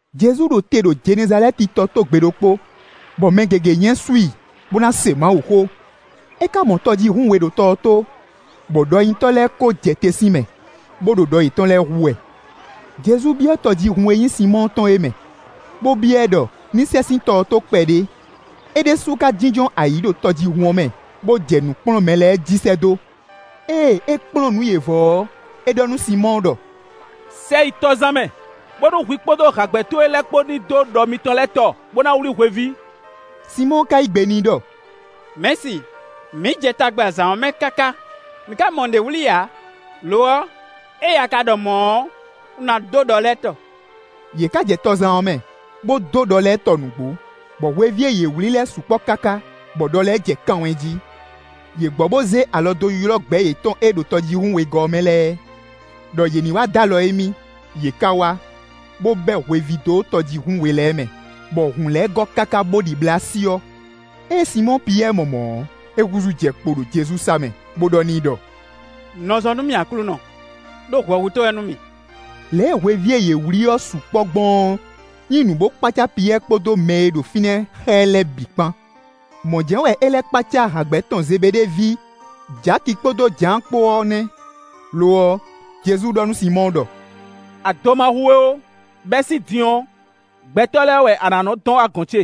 Jezu ɖo te ɖo Jenɛzalɛ́ti tɔ tó gbe ɖokpó, bɔ mɛ gěgé nyɛ́sú i, bó ná se Mawuxó. É ka mɔ tɔjíhún we ɖo tɔ ɔ́ tó, bɔ ɖɔnyitɔ́ lɛ́ɛ ko jɛ te sín mɛ, bó ɖo ɖɔ yětɔn lɛ́ɛ hú wɛ. Jezu byɔ́ tɔjíhún e nyí Sinmɔ́ɔ tɔn é mɛ, bó byɔ́ ɛ ɖɔ ní sɛ sín tɔ ɔ́ tó kpɛɖé; é ɖésú ka jínjɔ́n ayǐ ɖo tɔjíhún ɔ́ mɛ, bó jɛ nǔ kplɔ́n mɛ lɛ́ɛ jí sɛ́ dó. Ée é kplɔ́n nǔ yě vɔ ɔ́, é ɖɔ nú Sinmɔ́ɔ ɖɔ: “Sɛ yi tɔzan mɛ, bónú hwi kpódó hǎgbɛ́ towe lɛ́ɛ kpó ní dó ɖɔ mitɔn lɛ́ɛ tɔ, bó ná wlí hweví.” Sinmɔ́ɔ ka yí gbe n'i ɖɔ: “Mɛ̌si, mǐ jɛ tagba zǎn ɔ́ mɛ káká, mǐ ká mɔ nǔɖé wlí ǎ. Lo ɔ́, ée a ka ɖɔ mɔ̌ ɔ́, un ná dó ɖɔ lɛ́ɛ tɔ.” Yě ká jɛ tɔzan ɔ́ mɛ, bó dó ɖɔ lɛ́ɛ tɔ nǔgbó, bɔ hweví e yě wlí lɛ́ɛ sukpɔ́ káká, bɔ ɖɔ lɛ́ɛ jɛ kan wɛ́n jí. Yě gbɔ bó zé alɔ dó ylɔ́ gbɛ̌ yětɔn e ɖo tɔjíhún wegɔ́ ɔ́ mɛ lɛ́ɛ, ɖɔ yě ní wá dó alɔ émí. Yě ká wá, bó bɛ́ hweví dó tɔjíhún we lɛ́ɛ mɛ, bɔ hun lɛ́ɛ gɔ́ káká bó ɖibla syɔ́. Ée Sinmɔ́ɔ Piyɛ́ɛ mɔ mɔ̌ ɔ́, é húzú jɛ kpo ɖo Jezu sá mɛ, bó ɖɔ n'i ɖɔ: “Nɔ zɔ nú mì Aklúnɔ, ɖó hwɛhutɔ́ wɛ nú mì.” Lě e hweví e yě wlí ɔ́ sukpɔ́ gbɔn ɔ́ nyí nǔ bó kpácá Piyɛ́ɛ kpódó mɛ e ɖo fínɛ́ xá ɛ lɛ́ɛ bǐ kpán. Mɔ̌ jɛ́n wɛ é lɛ́ kpácá hǎgbɛ́ tɔn Zebeɖée ví, Jaki kpódó Jǎan kpó ɔ́ nɛ́. Lo ɔ́, Jezu ɖɔ nú Sinmɔ́ɔ ɖɔ: “Ado ma hu we ó; bɛ́ sín din ɔ́, gbɛtɔ́ lɛ́ɛ wɛ a nǎ nɔ́ dɔn wá gɔ̌n ce.”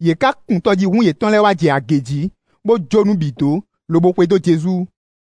Yě ká kun tɔjíhún yětɔn lɛ́ɛ wá jɛ agě jǐ, bó jó nǔ bǐ dó, lobo xwedó Jezu.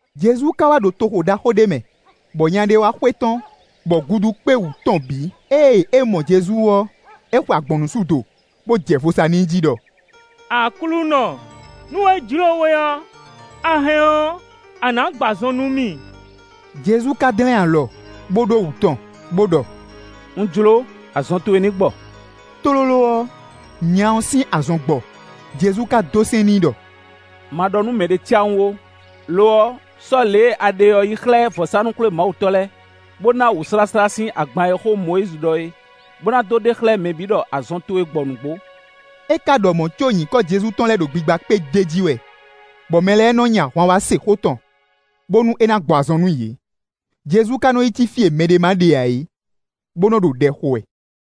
Jezu ka wá ɖo toxo ɖaxó ɖé mɛ, bɔ nya ɖé wá xwetɔ́n, bɔ gudu kpé wú tɔn bǐ. Ée é mɔ Jezu ɔ́, é xwe agbɔ̌nnusú do, bó jɛ vo sa n'i jí ɖɔ: “Aklúnɔ, nú é jlǒ we ɔ́, a hɛn ɔ́, a nǎ gbɔ azɔn nú mì.” Jezu ka dlɛ́n alɔ, bó ɖó wǔ tɔn, bó ɖɔ: “Un jló, azɔn towe ní gbɔ.” Tlóló ɔ́, nya ɔ́ sín azɔn gbɔ. Jezu ka dó sɛ́n n'i ɖɔ: “Ma ɖɔ nú mɛɖé cáwún ó, lo ɔ́, sɔ́ lě e a ɖe ɔ́ yi xlɛ́ vɔ̌sánú-xwlémawutɔ́ lɛ́ɛ, bó ná wǔsláslá sín agban e xó Mɔyízi ɖɔ é, bó ná dó ɖe xlɛ́ mɛ bǐ ɖɔ azɔn towe gbɔ nǔgbó.” É ká ɖɔ mɔ̌ có nyǐkɔ Jezu tɔn lɛ́ ɖo gbigba kpé d'é jí wɛ, bɔ mɛ lɛ́ɛ nɔ́ nyi ahwan wá se xó tɔn, bónú é ná gbɔ azɔn nú yě. Jezu ka nɔ yi cí fí e mɛɖé má ɖe ǎ é, bó nɔ́ ɖo ɖɛ xo wɛ.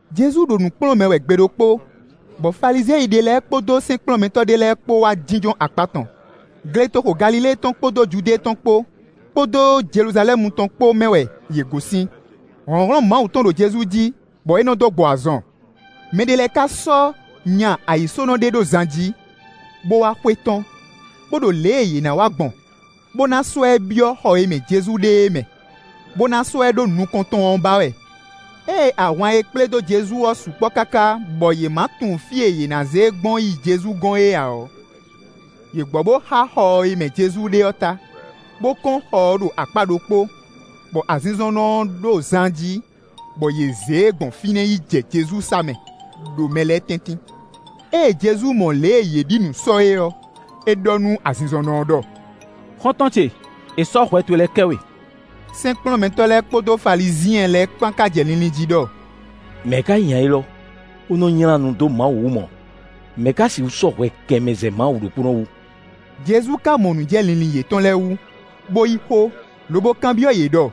Jezu ɖo nǔ kplɔ́n mɛ wɛ gbe ɖokpó, bɔ Falizyɛn ɖé lɛ́ɛ kpódó sɛ́nkplɔ́nmɛtɔ́ ɖé lɛ́ɛ kpó wá jínjɔ́n akpá tɔn. Gletoxo Galilée tɔn kpódó Judée tɔn kpó, kpódó Jeluzalɛ́mu tɔn kpó mɛ wɛ yě gosín. Hlɔ̌nhlɔ́n Mawu tɔn ɖo Jezu jí, bɔ é nɔ́ dó gbɔ azɔn. Mɛ ɖé lɛ́ɛ ká sɔ́ nya ayǐsónɔ ɖé ɖó zan jí, bó wá xwetɔ́n, bó ɖo lě e yě ná wa gbɔn, bó ná sɔ́ ɛ byɔ́ xɔ e mɛ Jezu ɖe é mɛ, bó ná sɔ́ ɛ ɖó nukɔn tɔn ɔ́ ba wɛ. Ée ahwan e kplé dó Jezu ɔ́ sukpɔ́ káká bɔ yě ma tunwun fí e yě ná zé e gbɔn yi Jezu gɔ́n é ǎ ɔ́, yě gbɔ bó xá xɔ e mɛ Jezu ɖe ɔ́ ta, bó kɔ́n xɔ ɔ́ ɖo akpá ɖokpó, bɔ azinzɔnnɔ ɔ́ ɖo zan jí, bɔ yě zé e gbɔn fínɛ́ yi jɛ Jezu sá mɛ, ɖo mɛ lɛ́ɛ tɛ́ntin. Ée Jezu mɔ lě e yě ɖi nǔ sɔ́ é ɔ́, é ɖɔ nú azinzɔnnɔ ɔ́ ɖɔ: “Xɔ́ntɔn ce, è sɔ́ hwɛ towe lɛ́ɛ kɛ we.” Sɛ́nkplɔ́nmɛtɔ́ lɛ́ɛ kpódó Falizyɛn lɛ́ɛ kpán ka jɛ linlin jí ɖɔ: “Mɛ̌ ka nyí nya élɔ́, bó nɔ́ nylá nu dó Mawu wú mɔ̌? Mɛ̌ ká sixú sɔ́ hwɛ kɛ mɛ zɛ Mawu ɖokpónɔ wú?” Jezu ka mɔ nǔ jɛ linlin yětɔn lɛ́ɛ wú, bó yí xó, lobo kanbyɔ́ yě ɖɔ: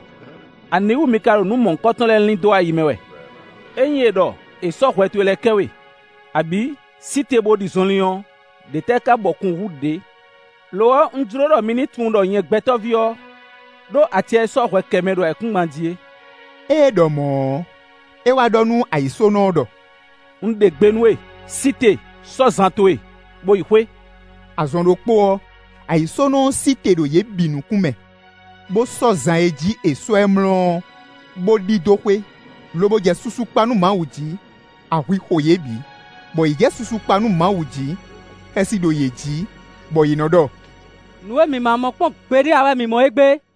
“Aniwútu mi ka ɖo nǔ mɔ̌hunkɔtɔn lɛ́ɛ lin dó ayi mɛ wɛ? Ényí è ɖɔ: ‘È sɔ́ hwɛ towe lɛ́ɛ kɛ we,’ abǐ: ‘Sí te bó ɖi zɔnlin’ ɔ́, ɖě tɛ́ ka bɔ kun hú ɖě? Lo ɔ́, un jló ɖɔ mi ní tunwun ɖɔ nyɛ Gbɛtɔ́ví ɔ́, ɖó acɛ e sɔ́ hwɛ kɛ mɛ ɖo ayǐkúngban jí é.” Ée é ɖɔ mɔ̌ ɔ́, é wá ɖɔ nú ayǐsónɔ ɔ́ ɖɔ: “Un ɖe gbe nú we, sí te, sɔ́ zan towe, bó yi xwé.” Azɔn ɖokpó ɔ́, ayǐsónɔ ɔ́ sí te ɖo yě bǐ nukún mɛ, bó sɔ́ zan e jí è sɔ́ ɛ mlɔ́ ɔ́, bó ɖidó xwé, lobo jɛ susu kpa nú Mawu jí. Ahwi xo yě bǐ, bɔ yě jɛ susu kpa nú Mawu jí. Xɛsi ɖo yě jí, bɔ yě nɔ ɖɔ: “Nǔ e mǐ ma mɔ kpɔ́n gbeɖé ǎ wɛ mǐ mɔ égbé!”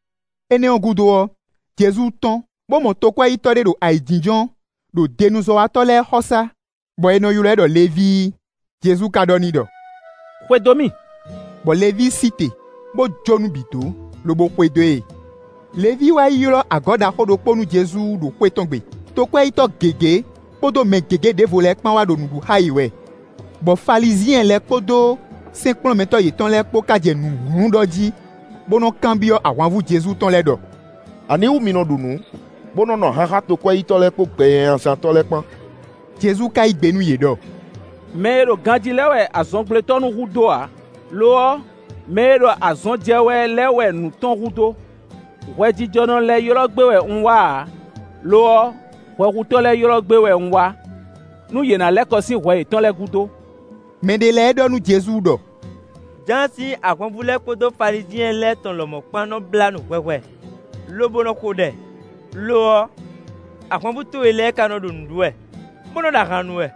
Énɛ́ ɔ́ gúdo ɔ́, Jezu tɔ́n, bó mɔ tokwɛ́yítɔ́ ɖé ɖo ayǐjínjɔ́n ɖo denuzɔ́watɔ́ lɛ́ɛ xɔsá, bɔ è nɔ ylɔ́ ɛ ɖɔ Levíi. Jezu ka ɖɔ n'i ɖɔ: “Xwedó mì.” Bɔ Levíi sí te, bó jó nǔ bǐ dó, lobo xwedó e. Levíi wá ylɔ́ agɔ̌ ɖaxó ɖokpó nú Jezu ɖo xwé tɔn gbe. Tokwɛ́yítɔ́ gěgé kpódó mɛ gěgé ɖěvo lɛ́ɛ kpán wá ɖo nǔ ɖu xá yě wɛ. Bɔ Falizyɛn lɛ́ɛ kpódó sɛ́nkplɔ́nmɛtɔ́ yětɔn lɛ́ɛ kpó ka jɛ nǔ hlún ɖɔ jí, bó nɔ́ kanbyɔ́ ahwanvú Jezu tɔn lɛ́ɛ ɖɔ: “Aniwú mi nɔ ɖu nǔ, bó nɔ́ nu ahan xá tokwɛ́yítɔ́ lɛ́ɛ kpódó gbɛnyanyazántɔ́ lɛ́ɛ kpán?” Jezu ka yí gbe nú yě ɖɔ: “Mɛ e ɖo ganjí lɛ́ɛ wɛ azɔngblétɔ́ nú hu dó ǎ, lo ɔ́, mɛ e ɖo azɔn jɛ wɛ lɛ́ɛ wɛ nǔ tɔn hu dó. Hwɛjijɔnɔ lɛ́ɛ ylɔ́ gbé wɛ un wá ǎ, lo ɔ́ hwɛhutɔ́ lɛ́ɛ ylɔ́ gbé wɛ un wá, nú yě ná lɛ́ kɔ sín hwɛ yětɔn lɛ́ɛ gúdo.” Mɛ ɖé lɛ́ɛ ɖɔ nú Jezu ɖɔ: “Jǎan sín ahwanvú lɛ́ɛ kpódó Falizyɛn lɛ́ɛ tɔn lɔmɔ̌ kpán nɔ́ blá nu hwɛhwɛ, lobo nɔ xo ɖɛ; lo ɔ́, ahwanvú towe lɛ́ɛ ka nɔ ɖo nǔ ɖu wɛ, bó nɔ́ ɖo ahan nu wɛ.”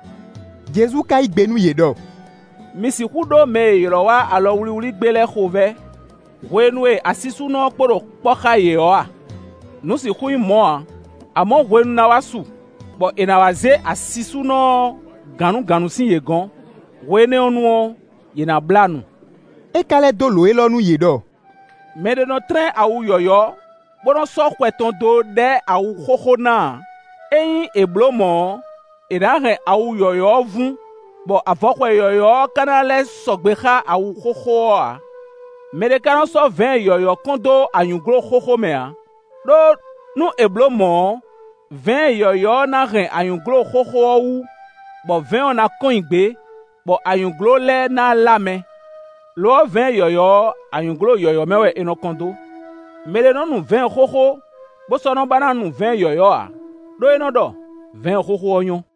Jezu ka yí gbe nú yě ɖɔ: “Mi sixú ɖó mɛ e è ylɔ́ wá alɔ wlíwlí gbé lɛ́ɛ xovɛ́, hwenu e asisúnɔ ɔ́ kpó ɖo kpɔ́ xá yě ɔ́ a? Nǔ sixú nyí mɔ̌ ǎ; amɔ̌ hwenu ná wá su, bɔ è nǎ wá zé asisúnɔ ɔ́ gǎnnugǎnnu sín yě gɔ̌n, hwe énɛ́ ɔ́ nu ɔ́, yě ná blá nu.” É ka lɛ́ dó lǒ élɔ́ nú yě ɖɔ: “Mɛ ɖé nɔ́ tlɛ́n awu yɔ̌yɔ́, bó nɔ́ sɔ́ xwɛ tɔn dó ɖɛ́ awu xóxó ná ǎ; ényí è bló mɔ̌ ɔ́, è nǎ hɛn awu yɔ̌yɔ́ ɔ́ vún; bɔ avɔxwɛ yɔ̌yɔ́ ɔ́ ká ná lɛ́ sɔgbe xá awu xóxó ɔ́ ǎ. Mɛ ɖé ka nɔ́ sɔ́ vɛ̌ɛn yɔ̌yɔ́ kɔn dó anyǔglo xóxó mɛ ǎ; ɖó nú è blǒ mɔ̌ ɔ́, vɛ̌ɛn yɔ̌yɔ́ ɔ́ ná hɛn anyǔglo xóxó ɔ́ wú, bɔ vɛ̌ɛn ɔ́ ná kɔn nyi gbě, bɔ anyǔglo lɛ́ɛ ná lá mɛ. Lo ɔ́, vɛ̌ɛn yɔ̌yɔ́ ɔ́, anyǔglo yɔ̌yɔ́ mɛ wɛ è nɔ kɔn dó. Mɛ ɖé nɔ́ nu vɛ̌ɛn xóxó, bó sɔ́ nɔ́ ba ná nu vɛ̌ɛn yɔ̌yɔ́ ǎ, ɖó é nɔ́ ɖɔ: ‘Vɛ̌ɛn xóxó ɔ́ nyɔ́.’”